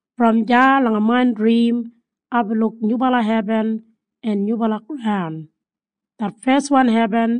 Brom deya langa main drim aibin luk nyubala hebin en nyubala graun. Det feswan hebin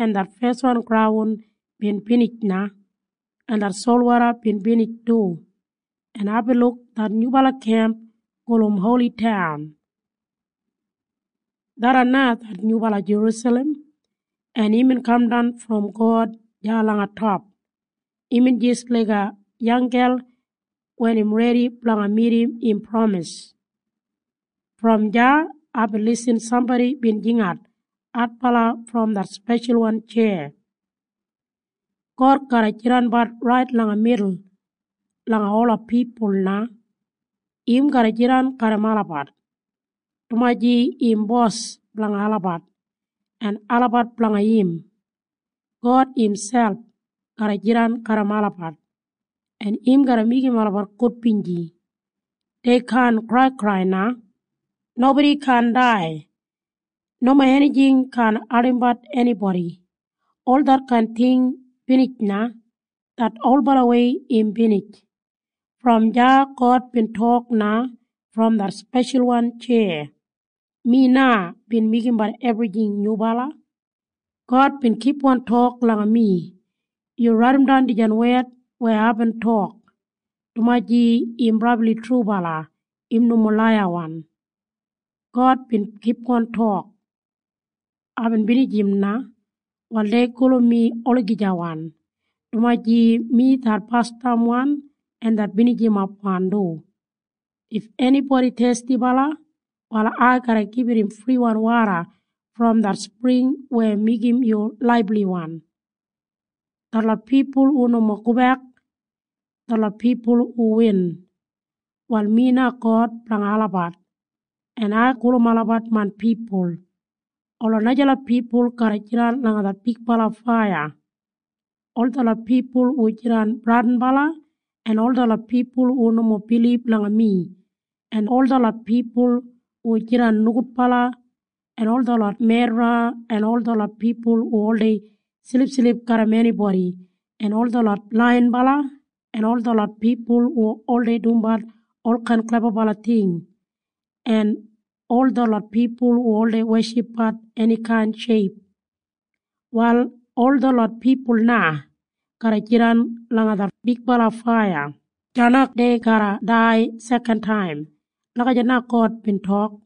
en det feswan graun bin binij na, en det solwoda bin binij du. En aibin luk det nyubala kemp gulum Holi Taun. Tharran na det nyubala Jerusalem, en imbin kamdan brom God deya langa top. Imbin jis laiga yanggel wen im redi blanga midim im pramis. Brom deya aibin lisin sambodi bin jingat adbala brom det speshalwan tjeya, “God garra jidanbat rait langa midul langa ola pipul na. Im garra jidan garram olabat, dumaji im Bos blanga olabat, en olabat blanga im. God imselp garra jidan garram olabat, en im garra meigim olabat gudbinji. Dei kaan kraikrai na. Nobodi kaan dai. Nomo enijing kaan ardimbat enibodi. Ol detkain ting binij na. Det olbalawei im binij.” Brom deya God bin tok na brom det speshalwan tjeya, “Mi na bin meigimbat ebrijing nyubala.” God bin kipgon tok langa mi, “Yu raidimdan dijan wed weya aibin tok, dumaji im brabli trubala. Im nomo laiyawan.” God bin kipgon tok, “Aibin binijim na. Wal dei gulum mi Olagijawan, dumaji mi det Basdamwan en det Binijimapwan du. If enibodi thestibala, wal ai garra gibit im friwan woda brom det spring weya meigim yu laibliwan. Detlot pipul hu nomo gobek, detlot pipul hu win, wal mi na God blanga olabat, en ai gulum olabat main pipul. Ola najalot pipul garra jidan langa det bigbala faiya. Ol detlot pipul hu jidan bradinbala en ol detlot pipul hu nomo bilib langa mi en ol detlot pipul hu jidan nogudbala en ol detlot medra en ol detlot pipul hu oldei silipsilip garram enibodi en ol detlot laiyinbala en ol detlot pipul hu oldei dumbat olkain klebabala ting en ol detlot pipul hu oldei weshipbat enikain sheip, wal ol detlot pipul na garra jidan langa det bigbala faiya. Deya na dei garra dai sekantaim.” Lagijat God bin tok.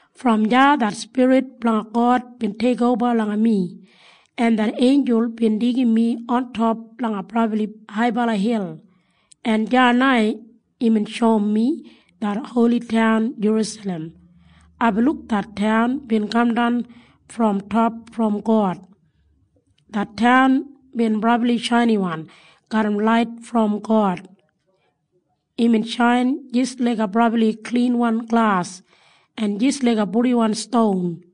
Brom deya det Spirit blanga God bin teikoba langa mi, en det einjul bin deigim mi ontop langa brabli haibala hil, en deya na imbin shoum mi det Holi Taun Jerusalem. Aibin luk det taun bin kamdan brom top brom God. Det taun bin brabli shainiwan garram lait brom God. Imbin shain jis laiga brabli klinwan glas en jis laiga purdiwan ston.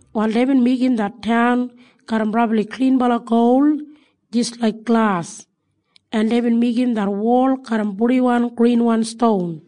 Wal deibin meigim det taun garram brabli klinbala gol jis laik glas. En deibin meigim det wol garram purdiwan grinwan ston.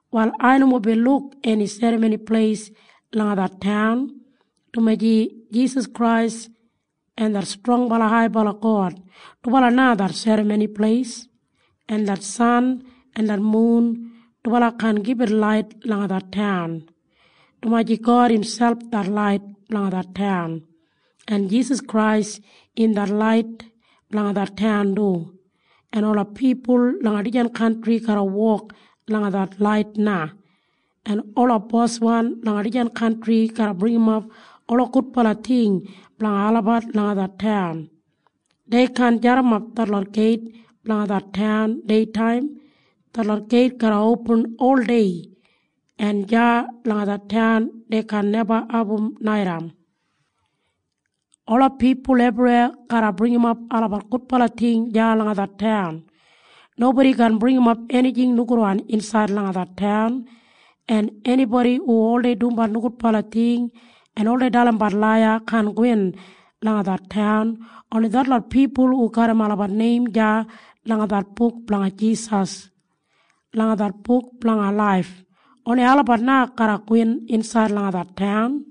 Wal ai nomo bin luk eni serramoni pleis langa det taun, dumaji Jisas Krais en det Brabli Haibala God, dubala na det serramoni pleis. En det san en mun dubala kaan gibit lait langa det taun, dumaji God imselp det lait blanga det taun. En Jisas Krais im lait blanga det taun du. En ola pipul langa dijan kantri garra wok langa det lait na, en ola boswan langa dijan kantri garra bringimap ola gudbala ting blanga olabat langa det taun. Dei kaan jadimap detlot geit blanga det taun deitaim. Detlot geit garra opin ol dei. En deya langa det taun dei kaan neba abum naitaim. Ola pipul ebriweya garra bringimap olabat gudbala ting deya langa det taun. Nobodi kaan bringimap enijing nogudwan insaid langa det taun, en enibodi hu oldei dumbat nogudbala ting en oldei dalimbat laiya kaan gowin langa det taun. Oni detlot pipul hu garram olabat neim deya langa det buk blanga Jisas, langa det Buk Blanga Laif, oni olabat na garra gowin insaid langa det taun.